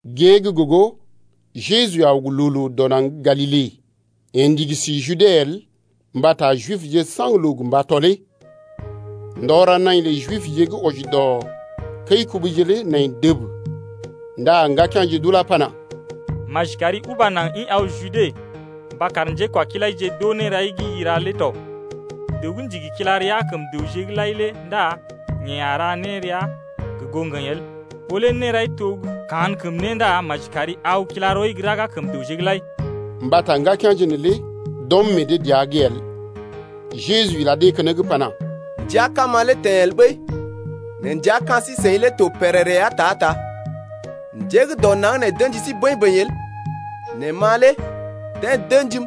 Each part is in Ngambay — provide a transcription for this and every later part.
Gée gə́ gogo Jeju aw gə loo-loo dɔ naŋg gə́ Galile, yeḛ ndigi si Jude el mbata Jibje saŋg loo gə mba tɔlee. Ndɔ ra naḭ lə Jibje gə́ wɔji dɔ kəi-kubuje lé nai dəb. Ndá ŋgakea̰je d’ulá pana: Maji kari uba naŋg ḭ aw Jude mba kar njékwakilaije d’oo nérai gə́ i ra lé tɔ. Dəw gə́ ndigi kila rəa kəm dəwje’g lai lé ndá yeḛ a ra nérea gə goo ŋgəḭ el. Ɓó lé nérai to gə kankəm né ndá maji kari aw kila rɔi gə raga kəm dəwje’g lai ya. Mbata ŋgakea̰je neelé d’ɔm meḛ dee dəa’g el. Jeju ila dee keneŋ pana: Ndəa kama lé teḛ el ɓəi, nɛ ndəa ka̰ sí-seḭ lé to pèrèrè ya ta-ta. Njé gə́ dɔ naŋg nee d’ə̰ji sí bəḭ-bəḭ el, nɛ ma lé deḛ d’ə̰jim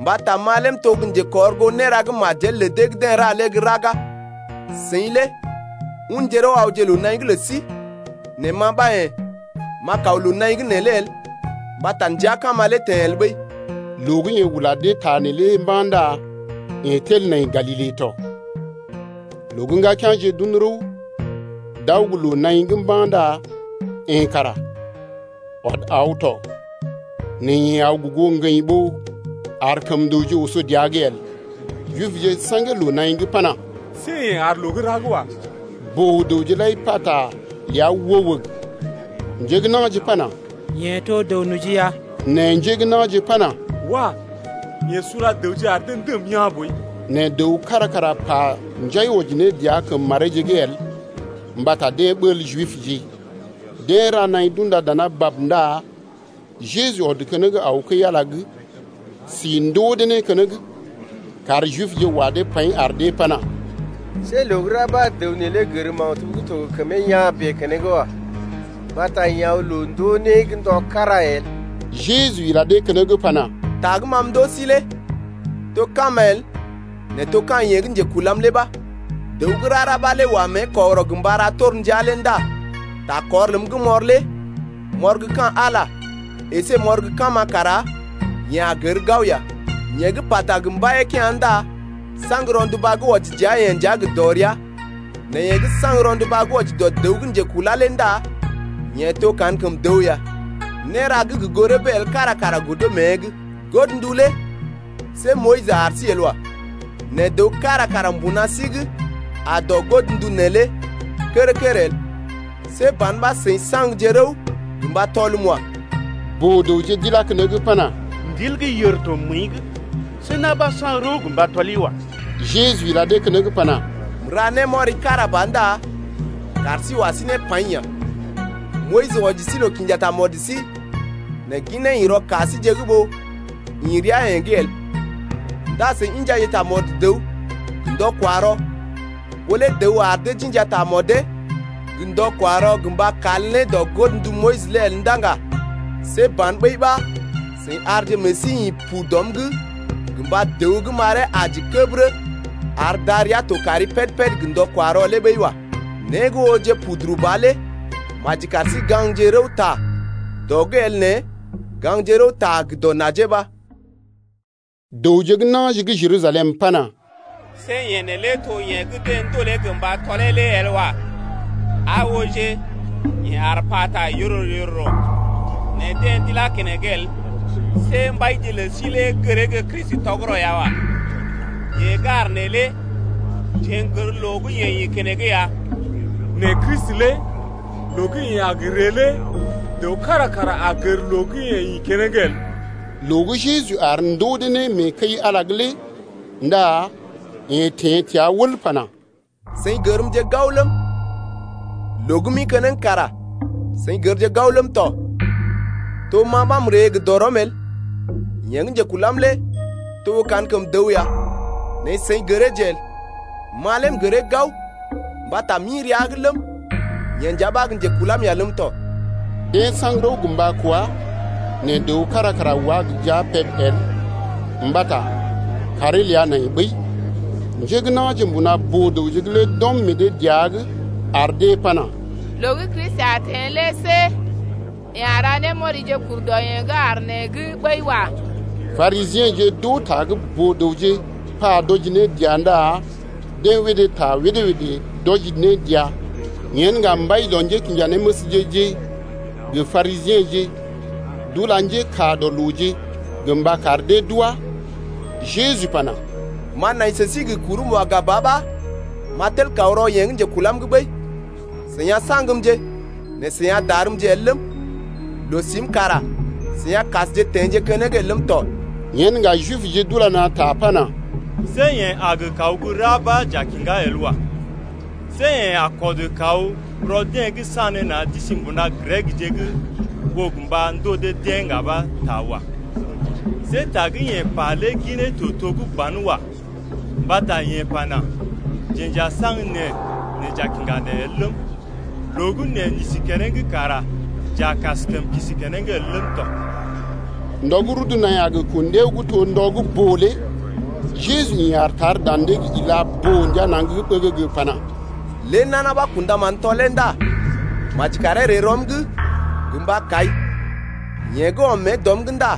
mbata ma lé m’to gə́ njekɔrgoo néra gə́ majel lə dee gə́ deḛ ra lé gə́ raga. Seḭ lé unje rəw awje loo-naḭ’g lə sí, nɛ ma ɓa yḛ̀ m’a kaw loo-naḭ’g neelé el mbata ndəa kama lé teḛ el ɓəi. Loo gə́ yeḛ ula dee ta neelé mba̰ ndá yeḛ tel nai Galile tɔ. Loo gə́ ŋgakea̰je d’un rəw d’aw gə́ loo-naḭ’g mba̰ ndá yeḛ kara ɔd aw tɔ nɛ yeḛ aw gə goo ŋgəḭ ɓó ar kəm dəwje oso dəa’g el. Jibje saŋgee loo-naḭ’g pana: See yeḛ aar loo gə́ ra’g wa. Boo-dəwje lai pata ləa wəg-wəg. Njé gə́ na̰je pana: Yeḛ to dəw-noji ya. Nɛ njé gə́ na̰je pana: Wah! yeḛ sula dəwje ar dee ndəm yaa̰ boi. Nɛ dəw kára kara pa njai wɔji ne dəa kəm mareeje’g el mbata deḛ ɓəl Jibje. Deḛ ra naḭ d’unda dana bab ndá Jeju ɔd keneŋ aw kəi-Ala’g si ndoo dee né keneŋ. Kaar Jibje wa dee paḭ ar dee pana: See loo gə́ ra ɓa dəw neelé gər maktub gə́ to gə kəmee yaa̰ bèe keneŋ wa. Mbata yeḛ aw loo-ndoo-né’g ndɔ kára el. Jeju ila dee keneŋ pana: Ta gə́ ma m’ndoo sí lé to kama el nɛ to ka̰ yeḛ gə́ njekulam lé ɓa. Dəw gə́ rara ɓa lé wa mée kɔgərɔ gə mba ra torndia lé ndá ta kɔr ləm gə́ m’ɔr lé m’ɔr gə ka̰ Ala əsé m’ɔr gə́ kama kara yeḛ a gər gao ya. Yeḛ gə́ pata gə mbaiyee-kea̰ ndá saŋg rɔnduba gə́ wɔji dəa-yeḛ nja gə dɔrea. Nɛ yeḛ gə́ saŋg rɔnduba gə́ wɔji dɔ dəw gə́ njekulá lé ndá yeḛ to kankəm dəw ya, néra gə́ gə goo rəbee el kára kara godo mée’g. Godndu lé see Moyis ar sí el wa. Nɛ dəw kára kara mbuna sí’g aa dɔ godndu neelé lé kər-kər el. See ban ɓa seḭ saŋgje rəw gə mba tɔlmje wa. Boo-dəwje d’ilá keneŋ pana: Ndil gə́ yèr to məəi’g. See na̰ ɓa saŋg rəw gə mba tɔli wa. Jeju ila dee keneŋ pana: M’ra némɔri kára ba ndá kaar sí wa sí ne paḭ ya. Moyis wɔji sí loo kinja tamɔd sí nɛ ginee ḭ rɔ ka síje’g ɓó ḭ rəa-yeḛ’g el. Ndá seḭ injaje tamɔd dəw gə ndɔ-kwa-rɔ. Ɓó lé dəw ar dee d’inja tamɔdee gə ndɔ-kwa-rɔ gə mba kal ne dɔ godndu Moyis lé el ndá ŋga see ban ɓəi ɓa seḭ arje meḛ sí ḭ pu dɔm’g gə mba dəw gə́ m’aree aji kəbərə ar darəa to kari péd-péd gə ndɔ-kwa-rɔ lé ɓəi wa. Né gə́ ooje puduru ba lé maji kar sí gaŋgje rəwta dɔ’g el nɛ gaŋgje rəwta gə dɔ najee ɓa. Dəwje gə́ na̰je gə́ Jerusalem pana: See yeḛ neelé to yeḛ gə́ gə mba tɔlee lé el wa. Aa ooje, yeḛ aar pata yororo-yororo nɛ deḛ d’ilá keneŋ el. See mbaije lə sí lé gəree gə́ Kristi tɔgərɔ ya wa. Yeḛ gə́ aar neelé jeḛ n’gər loo gə́ yeḛ ḭ keneŋ ya, nɛ Kristi lé loo gə́ yeḛ a gə ree lé dəw kára kara a gər loo gə́ yeḛ ḭ keneŋ el. Loo gə́ Jeju aar ndoo dee né mee kəi-Ala’g lé ndá yeḛ teḛ təa wəl pana: Seḭ gərmje gao ləm, loo gə́ m’ḭ keneŋ kara seḭ gərje gao ləm tɔ. To ma ɓa m’ree gə dɔrɔm el. Yeḛ gə́ njekulam lé to kankəm dəw ya, nɛ seḭ gəreeje el. Ma lé m’gəree gao, mbata ma m’ḭ rəa’g ləm, yeḛ nja ɓa gə́ njekulam ya ləm tɔ. Deḛ saŋg rəw gə mba kwá, nɛ dəw kára kara wá gə jia peb el mbata kàree ləa nai ɓəi. Njé gə́ na̰je mbuna boo-dəwje’g lé d’ɔm meḛ dee dəa’g ar dee pana: Loo gə́ Kristi a teḛ lé see yeḛ a ra némɔrije kur dɔ yeḛ gə́ aar nee’g ɓəi wa. Parisiḛje d’oo ta gə́ boo-dəwje pa d’wɔji ne dəa ndá deḛ wédé ta wédé-wédé d’wɔji ne dəa. Yen ŋga mbai dɔ njékinjanéməsje-je gə Parisiḛje d’ula njékaa dɔ looje gə mba kar dee d’wá. Jeju pana: M’a nai sə sí gə kurm waga ba ɓa m’a tel kaw rɔ yeḛ gə́ njekulam’g ɓəi. Seḭ a saŋgmje nɛ seḭ a darmje el ləm, loo-sim kara seḭ a kasje teḛje keneŋ el ləm tɔ. Yen ŋga Jibje d’ula na̰ ta pana: See yeḛ a gə kaw gə́ ra ɓa j’a kiŋgá el wa. See yeḛ a kɔd kaw rɔ deḛ gə́ sanéna̰ d’isi mbuna Grekje’g ɓó gə ndoo dee-deḛ ŋga ɓa ta wa. See ta gə́ yeḛ pa lé ginee to to gə́ banwa mbata yeḛ pana: Jeḛ j’a saŋg neḛ nɛ j’a kiŋga neḛ el ləm, loo gə́ neḛ n’isi keneŋ kara j’a kaskəm kisi keneŋ el ləm tɔ. Ndɔ gə́ rudu naḭ a gə kun ɗiao gə́ to ndɔ gə́ boo lé Jeju ḭ aar tar dan dee’g ila boo-ndia naŋg ɓəgəgə pana: Lé nana ɓa kṵdaman tɔlee ndá maji karee ree rɔm’g gə mba kai. Yeḛ gə́ ɔm mée dɔm’g ndá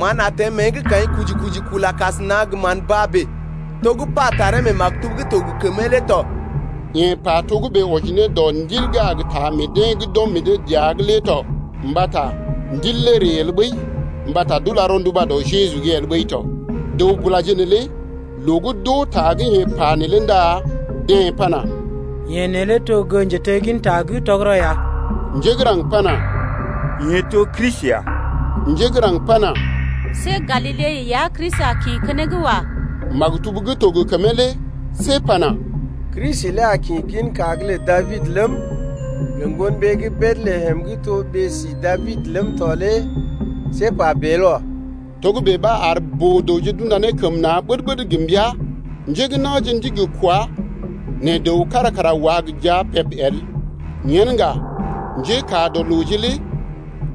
mán a teḛ mée’g kaḭ kuji-kuji kula kasəna gə mán baa bèe, to gə́ pa taree mee maktub’g gə́ to gə kəmee lé tɔ. Yeḛ pa togə́bè wɔji ne dɔ Ndil gə́ a taa meḛ deḛ gə́ d’a kɔm meḛ dee dəa’g lé tɔ. Mbata Ndil lé ree el ɓəi mbata d’ula rɔnduba dɔ Jeju’g el ɓəi tɔ. Dəw-bulaje neelé loo gə́ d’oo ta gə́ yeḛ pa neelé ndá deḛ pana: Yeḛ neelé to gə́ njetegginta gə́ tɔgərɔ ya. Njé gə́ raŋg pana: Yeḛ to Kristi ya. Njé gə́ raŋg pana: See Galile ya Kristi a kḭ keneŋ wa. Maktub gə́ to gə kəmee lé see pana: Kristi lé a kḭ ginka’g lə Dabid’g ləm, gə ŋgon ɓee gə́ Betlehem gə́ to ɓee-si Dabid ləm tɔ lé see pa bèe el wa. Togə́bè ɓa ar boo-dəwje d’unda ne kəm na̰ ɓəd-ɓəd gə mbəa. Njé gə́ na̰je ndigi kwá nɛ dəw kára kara wá gə jia peb el. Yen ŋga njékaa dɔ looje lé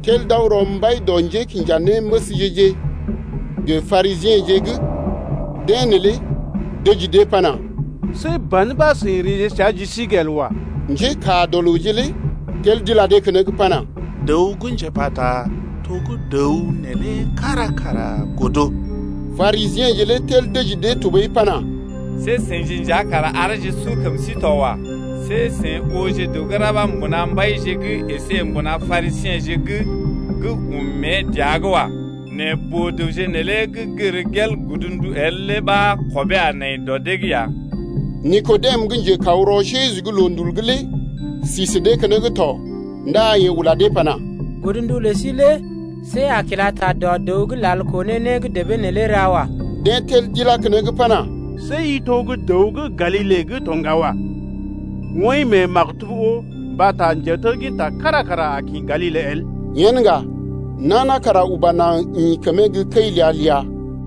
tel d’aw rɔ mbai dɔ njékinjanéməsje-je gə Parisiḛje’g. Deḛ neelé dəji dee pana: See ban ɓa seḭ reeje səa ji sí’g el wa. Njékaa dɔ looje lé tel d’ila dee keneŋ pana: Dəw gə́ njepata to gə́ dəw neelé kára kara godo. Parisiḛje lé tel dəji dee tɔɓəi pana: See seḭje nja kara areeje su kəm sí to wa. See seḭ ooje dəw gə́ ra ɓa mbuna mbaije’g əsé mbuna Parisiḛje’g gə́ ɔm mée dəa’g wa. Nɛ boo-dəwje neelé gə́ gər gel godndu lé el ɓa kɔbee a nai dɔ dee’g ya. Nikodem gə́ njekaw rɔ Jeju’g loondul’g lé si sə dee keneŋ tɔ ndá yeḛ ula dee pana: Godndu lə sí lé see a kila ta dɔ dəw’g lal koo ne né gə́ debee neelé ra wa. Deḛ tel d’ilá keneŋ pana: See i to gə́ dəw gə́ Galile’g tɔ ŋga wa. Woḭ mee maktub oo mbata njetegginta kára kara a kḭ Galile el. Yen ŋga nana kara uba naŋg ḭ kəmee gə́ kəi ləa-ləa.